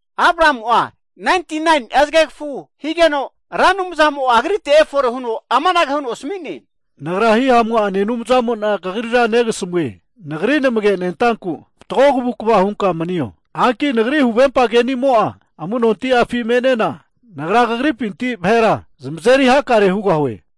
Abramu'a 99ni'a zgegfu higeno, Ra Anumzamo agrite efore huno amanage huno asmi'ne, Nagra Hihamu'ane Anumzamo'na negasmue. Nagri namagenentanku fatgo avu'ava hunka manio. Hanki Nagri huvempa keni'amo'a amu'nonti'afi me'nena, Nagra kagripinti vahera zamazeri hakare hugahue.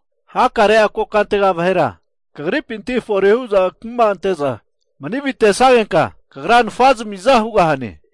Nagra kagrane hagerfine'na amanahu hugahue, Nagra hanenke'za kagripinti hakare kokantega kuma ante'za mani avitesnagenka nfazmi'za hugahane.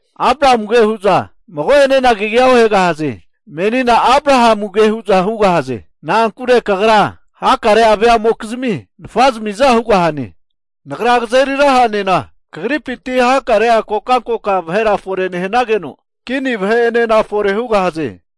Abramuge huza mago'ene kagia ohegahaze. Menina Abrahamuge hu'za hugahaze. Na'ankure kagra hakare'a veamokizmi nfazamiza hugahane. Nagra hanugeno, kagripinti hakare'a vahe fore nehanageno, kini vahera fore hugahaze.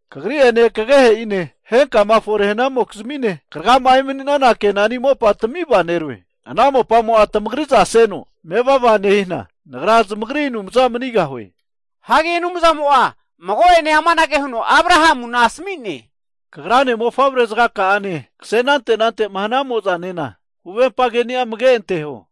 Kagri ene, kagehe'ine, henka fore hanamokizmine hageta emani'naza mopa, Kenani mopa tmivaneroe, ana mopamo tamagriza seno mevava nehina, Nagra Anumzantami manigahue. Anumzamo'a mago ene amanage huno Abrahamunku asmine, kagrane mofavrezga ka'ane kse anante anante hnamozanena huvempa keni'a amage anteho.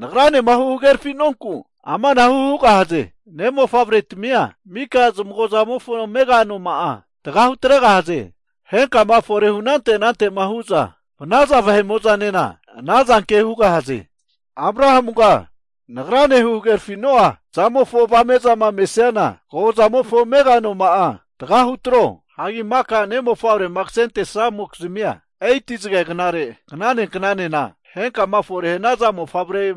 Hagerfi'nonku amanahu hugahaze, Ne' mofavretmia mika zamagozamofo amega anoma'a tga hutregahaze. Henka'ane fore hu' anante anante huza ehanatinamo'zane ana zanke hugahaze. Abrahamuga, Nagrane hagerfi'namofo avame'a, kagozamofo amega noma'a tga hutro. Ne' mofavre'ma ksentesamokizmia 8ti'a zge gnare, knane knane henka fore hnaza mofavre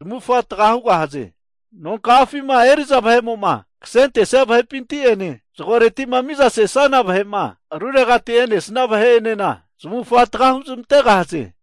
zamufga tga hugahaze. Nonka'afima eri'za vahe'mo'ma ksentesia vahe'pinti ene zgoreti'ma miza sesana vahe aruregati e'nesia vahe'ene, zamufa tga huzmantegahaze.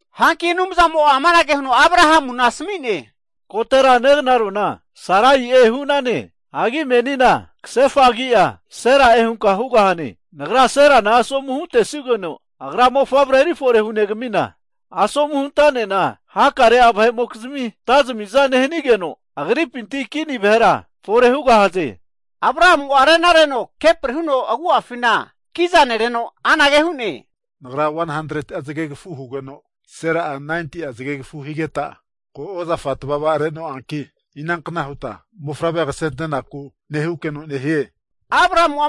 Hanki Anumzamo Abrahamu asmi'ne, kotera negnarona Sarai'e hu'nane hagi menina ksefa agi'a Sera'e hugahane. Nagra Serana asomu huntesugeno, agra mofavre eri fore hunegamina, asomu huntanena hakare'mokizmi antazmiza nehnigeno, agripinti kini vahera fore hugahaze. Anumzamo anage huno nesmigeno, Abrahamu rena reno kepri huno agu'afi kiza rene, Nagra 100ti'a zgegfu hugeno Sera'a 90ti'a zgegfu higeta, ko' ozafa tvava re'noanki, inankna huta mofavre ksentenaku nehukeno nehie? Abrahamu'a,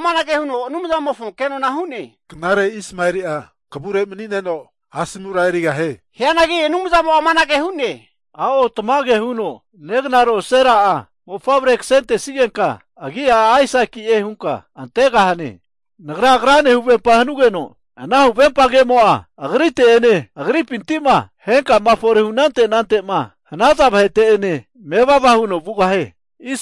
Anumzamofonku amanage hu'ne, knare Ismaeli'a kavure mani'neno asomura erigahie! Hianagi Anumzamo'a amanage hu'ne, a'o tamage huno negnaro Sera'a mofavre kasentesigenka, agi'a Aisaki'e hunka antegahane. Nagra huvempa ke'ni'a agrite ene, agripinti henka'a fore hanaza vahepine mevava hugahie.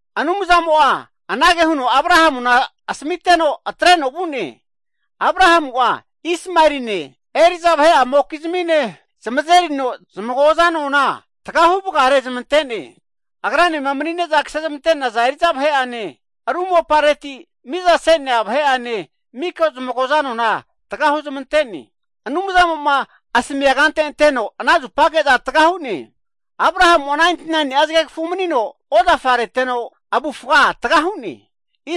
Anumzamo anage huno Abrahamu asmiteno atreno vu'ne. Abrahamu'a Ismaeline, kato vahe'a mokizmine zamazerino zamagoza noma'a tga huvgare zamante'ne. Agri nompi ksente'nea kato vahe'ane, ru mopareti miza se'nea kato vahe'ane mafka'a tga hu'ne. Anumzamo asmiaza huno ana zupage'za tga hu'ne. Abrahamu'a 99ni'a zgegfu manino ozafa reteno avufga tga hu'ne.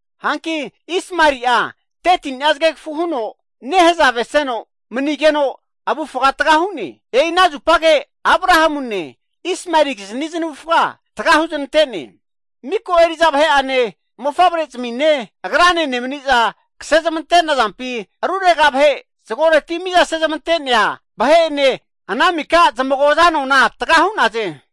Hanki Ismaeli 13ni'a zgegfu nehazave seno manigeno avufga tga hu'ne. E'i ana zupage Abrahamune, Ismaelikizni znavufga tga huznante'ne. Miko eri'za vahe'ane, mofavrezimi agrane nemniza ksente'nazampi, arurega vahe zgoreti miza sezmantene'a vahe'ene ana mika zamufa ano tga hu'naze.